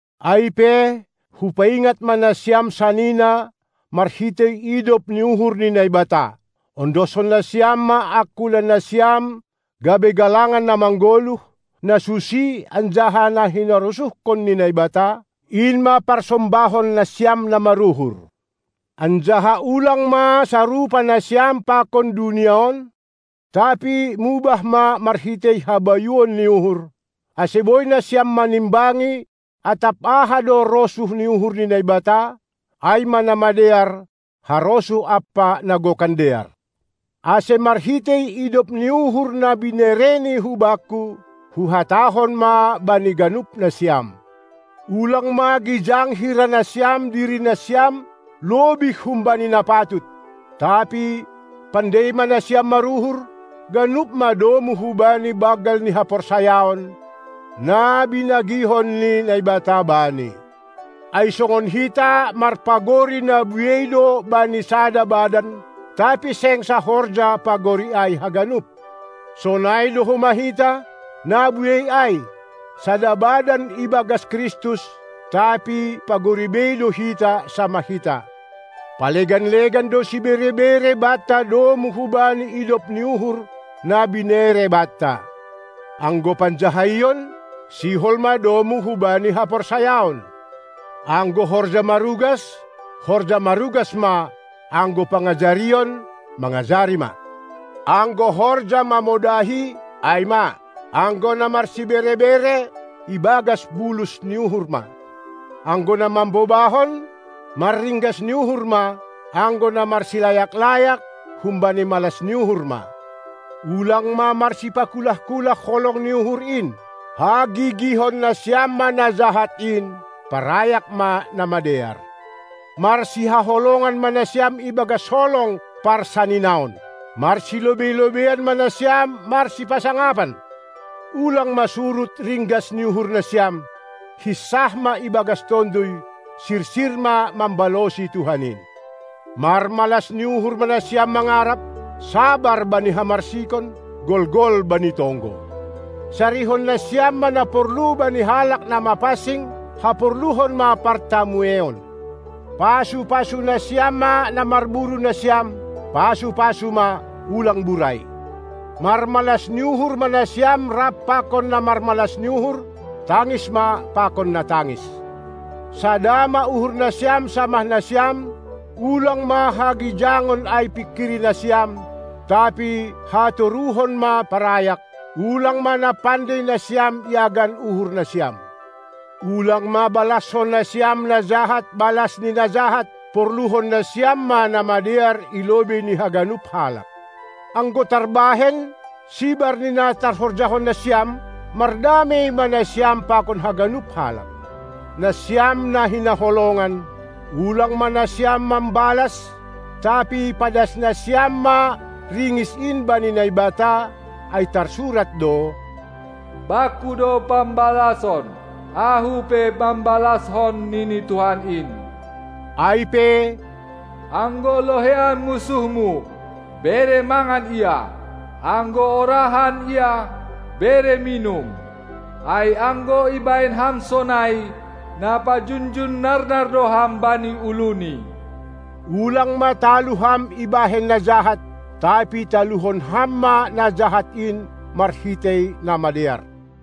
Ai pe, hupaingat ma nasiam sanina marhitei idop ni uhur ni Naibata: Ondoskon nasiam ma angkulanasiam gabe galangan na manggoluh, na susi anjaha na hinarosuhkon ni Naibata, in ma parsombahonnasiam na maruhur! Anjaha ulang ma sarupa nasiam pakon dunia on, tapi mubah ma marhitei habayuon ni uhur, ase boi nasiam manimbangi atap aha do rosuh ni uhur ni Naibata, ai ma na madear, harosuh ampa na gokan dear. Ase marhitei idop ni uhur na binereni hubakku, huhatahon ma bani ganup nasiam: Ulang ma gijang hira nasiam dirinasiam lobih humbani na patut, tapi pandei ma nasiam maruhur, ganup ma domu hubani banggal ni haporsayaon, na binagihon ni Naibata bani. Ai songon hita marpagori na buei do bani sada badan, tapi seng sahorja pagori ai haganup, sonai do homa hita, na buei ai, sada badan ibagas Kristus, tapi pagori bei do hita samah hita. Palegan-legan do sibere-bere banta domu hubani idop ni uhur na binere banta. Anggo panjahaion, sihol ma domu hubani haporsayaon. Anggo horja marugas, horja marugas ma; anggo pangajarion, mangajari ma! Anggo horja mamodahi, ai ma; anggo na marsibere-bere, ibagas bulus ni uhur ma; anggo na mambobahon, marringgas ni uhur ma; anggo na marsilayak-layak, humbani malas ni uhur ma. Ulang ma marsipakulah-kulah holong ni uhur in! Hagigihon nasiam ma na jahat in, parayak ma na madear! Marsihaholongan ma nasiam ibagas holong parsaninaon! Marsilobei-lobeian ma nasiam marsipasangapan! Ulang ma surut ringgas ni uhurnasiam, hinsah ma ibagas tonduy, sisir ma mambalosi Tuhan in! Marmalas ni uhur ma nasiam mangarap, sabar bani hamarsikon, golgol bani tonggo! Sarihon nasiam ma na porlu bani halak na mapansing; haporluhon ma partamueion! Pasu-pasu nasiam ma na marburu nasiam, pasu-pasu ma, ulang burai! Marmalas ni uhur ma nasiam rap pakon na marmalas ni uhur, tangis ma pakon na tangis! Sada ma uhurnasiam samah nasiam; ulang ma hagijangon ai pingkiri nasiam, tapi hatoruhon ma parayak; ulang ma na pandei nasiam iagan uhurnasiam! Ulang ma balaskon nasiam na jahat balas ni na jahat; porluhon nasiam ma na madear i lobei ni haganup halak. Anggo tarbahen, sibar ni na tarhorjahon nasiam, mardamei ma nasiam pakon haganup halak. Nasiam, na hinaholongan, ulang ma nasiam mambalas, tapi padas nasiam ma ringis in bani Naibata, ai tarsurat do: Bangku do pambalason, Ahu pe mambalaskon, nini Tuhan in. Ai pe, anggo loheian munsuhmu, bere mangan ia; anggo horahan ia, bere minum! Ai anggo ibahen ham sonai, na pajunjun narnar do ham bani uluni. Ulang ma talu ham ibahen na jahat, tapi taluhon ham ma na jahat in marhitei na madear.